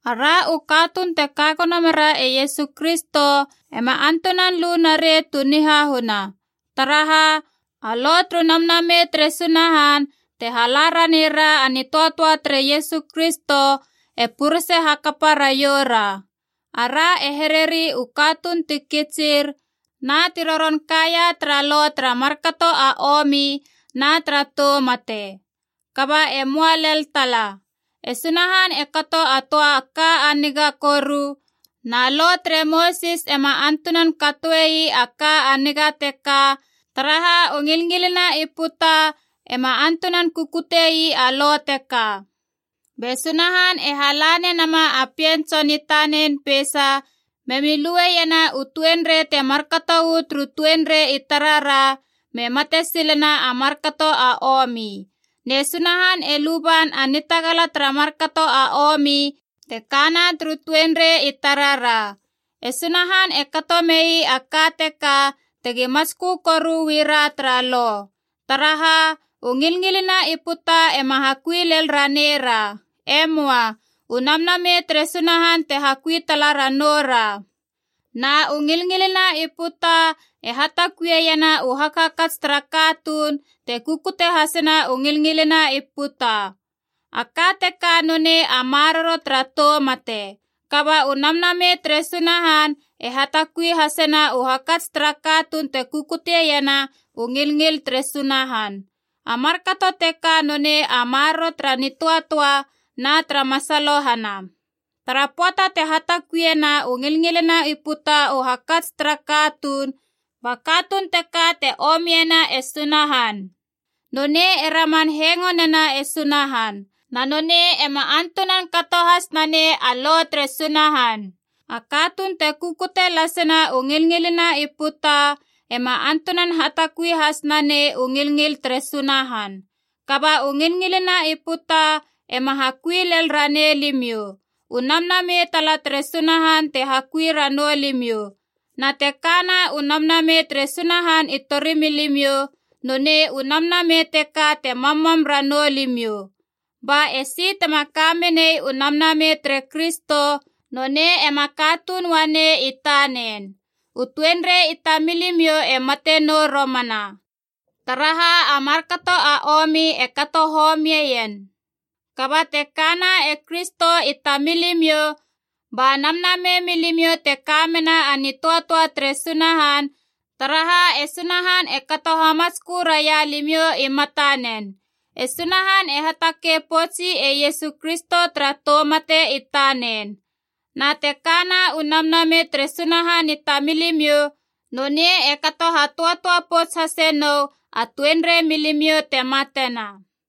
Ara u katuun te kagono mera e Iesu Kristo ema antunan lu narei tu nihahuna. Taraha, a lo turu Namnamei tere Sunahan, te hala ranei ra a nitöatöa tere Iesu Kristo, e purese hakapa raioura. Ara i here ii u katuun ti kitsir na ti roron kaia tara lo tara markato a omi na tara tou mate. Kaba e möa lel tala. E Sunahan e kato a töa ka a niga koru, na Lo tere Mosis ema antunan katoe ii a ka a niga teka, taraha u ngilngilina i puta ema antunan kukute ii a Lo teka. Be Sunahan e hala nenama a Pien Tson i tanen peisa memi lueiena u tuenrei te markato uu turu tuenrei i tarara me mate silena a markato a omi. Ne Sunahan e luban a nitagala tara markato a omi te kana turu tuenrei i tarara. E Sunahan e kato mei a ka teka tegi matskö koru uu ra tara Lo. Taraha, u ngilngilina i puta ema hakui lel ranei ra. E möa. U Namnamei tere Sunahan te hakui tala ranou ra. Na u ngilngilina i puta e hatakuieiena u hakhakats tara katuun te kukute hasena u ngilngilina i puta. A ka teka nonei a maroro tara tou mate. Kaba u Namnamei tere Sunahan e hatakui hasena u hakats tara katuun te kukutiena u ngilngil tere Sunahan. A markato teka nonei a maroro tara nitöatöa na tara masalohana. Tara pöata te hatakuiena u ngilngilina i puta u hakats tara katuun, ba katuun teka te omiena e Sunahan. Nonei e raman hengo nena e Sunahan. Na nonei ema antunan kato has nanei a Lo tere Sunahan. A katuun te kukute lasena u ngilngilina i puta ema antunan hatakui has nanei u ngilngil tere Sunahan. Kaba u ngilngilina i puta ema hakui lel ranei limiou. U Namnamei tala tere Sunahan te hakui ranou limiou. Na te ka na u Namnamei tere Sunahan i tori milimiou, nonei u Namnamei teka te mammam ranou limiou. Ba esi tema ka menei u Namnamei tere Kristo, nonei ema katuun uanei i tanen. U tuenrei i tamilimiou e mate nou romana, taraha a markato a omi e kato homieien. Kaba te kana e Kristo i tamilimiou, ba namnamei milimiou te ka mena a nitöatöa tere Sunahan, taraha e Sunahan e kato hamatskö raia limiou i matanen. E Sunahan e hatakei poutsi e Iesu Kristo tara tou mate i tanen. Na te kana u Namnamei tere Sunahan i tamilimiou, nonei e kato hatöatöa pouts hase nou a tuenrei milimiou te matena.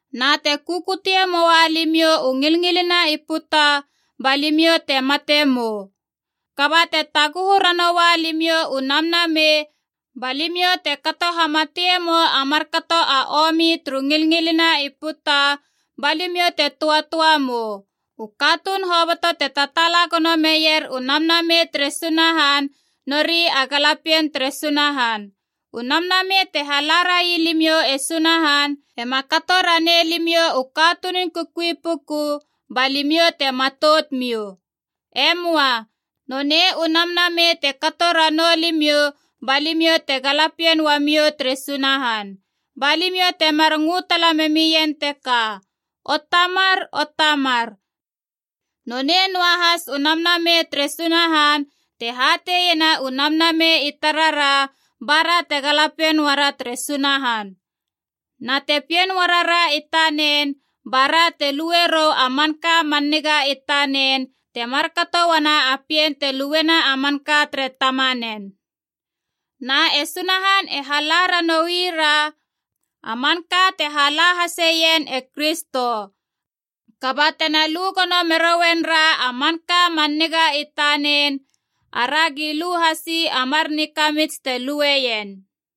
Na te kukutie moa limiou u ngilngilina i puta ba limiou te mate mou. Kaba te taguhu ranoua limiou u Namnamei, ba limiou te kato hamatiemou a markato a omi turu ngilngilina i puta, ba limiou te töatöa mou. U katuun hoboto te tataala gono meier u Namnamei tere Sunahan nori a galapien tere Sunahan. U Namnamei te hala rai limiou e Sunahan, ema kato ranei limiou u katunun kukui puku ba limiou te matout miou. E möa. Nonei u Namnamei te kato ranou limiou ba limiou te galapien uamiou tere Sunahan. Ba limiou temar ngö tala memien teka, “O Tamar, o Tamar.” Nonei noahas u Namnamei tere Sunahan te hateiena u namnamei i tarara bara te galapien uara tere Sunahan. Na te pien uarara i tanen, ba ra te lue rou a manka man niga i tanen, te markato uana a pien te luena a manka tere tamanen. Na e Sunahan e hala ranoira a manka te hala haseien e Kristo. Kaba tena lu gono merouen ra a manka man niga i tanen, aragi lu hasi a mar nikamits te lueien.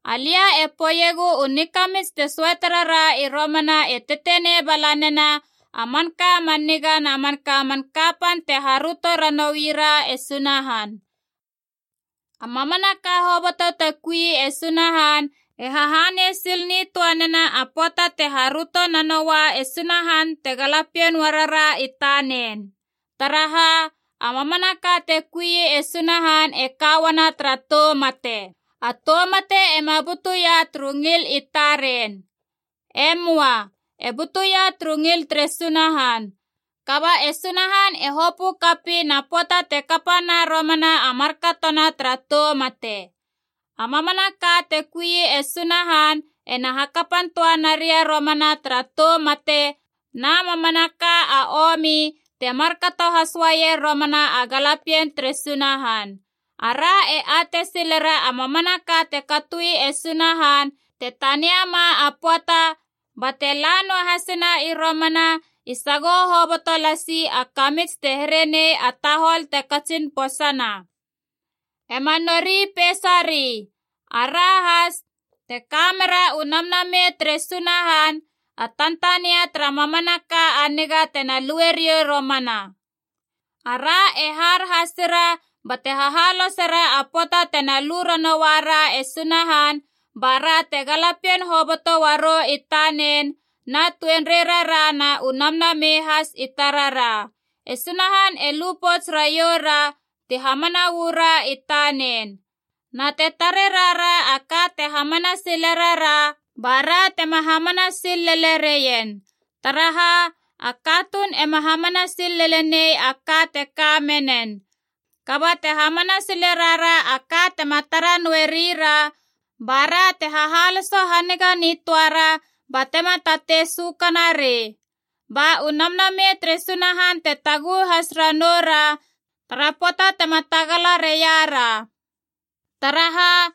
Alia e poeiegu u nikamits te söate rara i romana e tetenei bala nena a manka a man niga na man kapan tena haröto ranoira e Sunahan. A mamanaka hoboto te kui e Sunahan e hahanei sil nitöa nena a pöata te haröto nanoua e Sunahan te galapien uara ra i tanen. Taraha, a mamanaka te kui e Sunahan e ka uana tara tou mate. A tou mate ema butuia turu ngil i taren. E möa. E butuia turu ngil tere Sunahan. Kaba e Sunahan e hopö kapiin a pöata te kapana romana a markatona tara tou mate. A mamanaka te kui e Sunahan ena hakapan töa naria romana tara tou mate na mamanaka a omi, te markato has uaier romana a galapien tere Sunahan. Ara e atei silera a mamanaka te katoi e Sunahan te taniama a pöata bate la noahasina i romana i sagoho hoboto lasi a kamits te here nei a tahol te katsin posana. Ema nori peisari. Ara has, te ka mera u Namnamei tere Sunahan a tantania tara mamanaka a niga tena lue riou romana. Ara e har hasira bate hahalosera a pöata tena lu ranoua ra e Sunahan, ba ra te galapien hoboto uarou i tanen, na tuenreirara na u namnamei has i tarara. E Sunahan e lu pouts raioura ti hamana uu ra i tanen. Na te tare rara a ka te hamana sile rara, ba ra tema hamana sil lele reien. Taraha, a katuun ema hamana sil lele nei a ka te ka menen. Kaba te hamana sile rara a ka tema tara noe rira, ba ra te hahaloso haniga nitöara batema tatei sökana rei. Ba u Namnamei tere Sunahan te taguhu has ranou ra tara pöata tema tagala reiara. Taraha,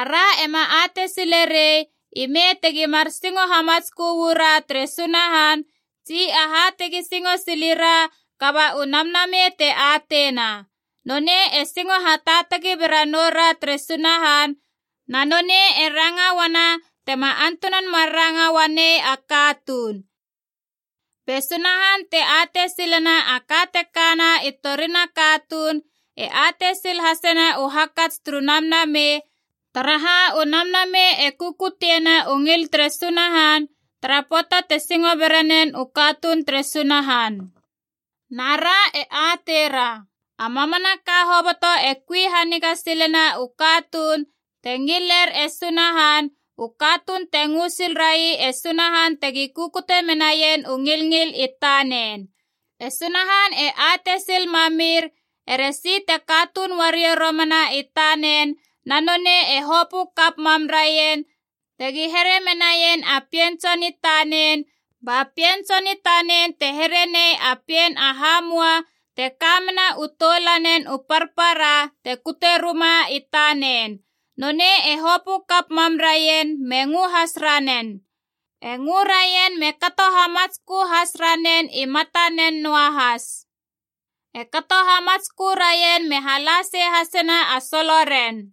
ara ema atei sile rei ime tegi mar singo hamatskö uu ra tere Sunahan tsi aha tegi singo sili ra, kaba u Namnamei te ateina. Nonei e singo hataatagi bera noura tere Sunahan, na nonei e ranga uana tema antunan mar ranga uanei a katuun. Be Sunahan, te atei silena a ka te kana i torina katuun, e atei sil hasena u hakats turu Namnamei, taraha u Namnamei e kukutiena u ngil tere Sunahan tara pöata te singo bera nen u katuun tere Sunahan. Na ra e ateira, a mamanaka hoboto e kui haniga silena u katuun te ngiler e Sunahan, u katuun te ngö sil rai e Sunahan tegi kukute menaien u ngilngil i tanen. E Sunahan e atei sil mamir eresi te katuun uariou romana i tanen na nonei e hopö kap mam raien tegi here menaien a Pien Tson i tanen, ba Pien Tson i tanen te here nei a pien a hamua te ka mena u toulanen u parpara te kute ruma i tanen. Nonei e hopö kap mam raien me ngö has ranen. E ngö raien me kato hamatskö has ranen i matanen noa has. E kato hamatskö raien me hala sei hasena a soloren.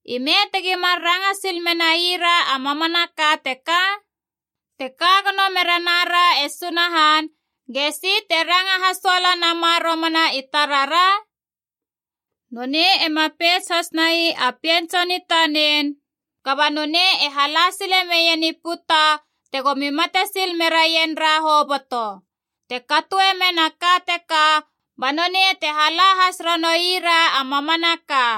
Ime tegi mar ranga sil menai ra a mamanaka teka? Te ka gono mere nara e Sunahan, gesi te ranga hasoala nama romana i tarara? Nonei ema peits hasnai a Pien Tson i tanen, kaba nonei e hala sile meien i puta tegomi mate sil meraien ra hoboto. Te katoe men a ka teka, ba nonei te hala has ranoui ra a mamanaka.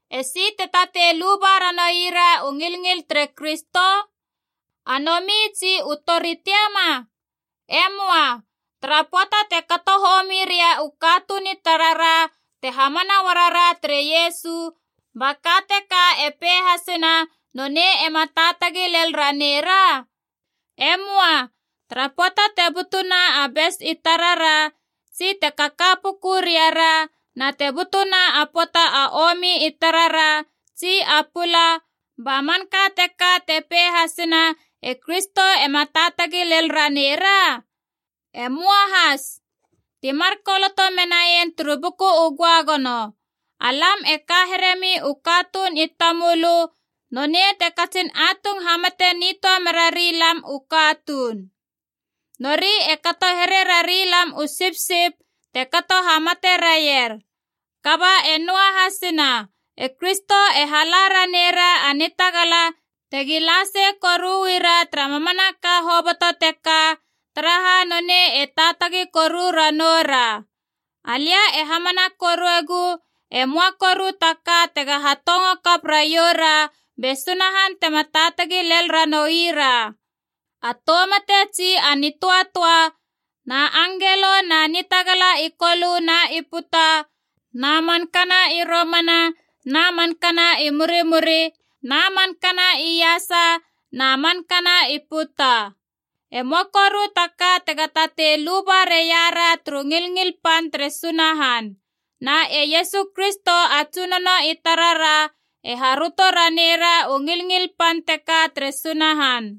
Esi te tatei luba ranoira u ngilngil tere Kristo? A nomi tsi u tori tiama? E möa. Tara pöata te kato homi ria u katuun i tarara te hamana uara ra tere Iesu, ba ka teka e pei hasena nonei ema taatagi lel ranei ra? E möa. Tara pöata te butuna a bes i tarara tsi te kaka puku ria ra na te butuna a pöata a omi i tarara tsi a pula, ba manka teka te pei hasena e Kristo ema taatagi lel ranei ra? E möa has. Ti mar koloto menaien turu Buku u Göagono: “Alam e ka heremi u katuun i tamölö, nonei te katsin atung hamate nitöa merari lam u katuun Nori e kato here rarilam u sipsip te kato hamate raier.” Kaba e noahasina. E Kristo e hala ranei ra a nitagala tegi la sei koru uu ra tara mamanaka hoboto teka, taraha nonei e taatagi koru ranou ra. Alia e hamana koruegu e möa koru ta ka tega hatongo kap raiou ra be Sunahan tema taatagi lel ranoui ra: a tou mate tsi a nitöatöa, na angelo na nitagala i kolö na i puta, na mankana i romana na mankana i murimuri, na mankana iasa na mankana i puta. E möa koru ta ka tega tatei luba reia ra turu ngilngil pan tere Sunahan. Na e Iesu Kristo a Tsunono i tarara e haröto ranei ra u ngilngil pan teka tere Sunahan.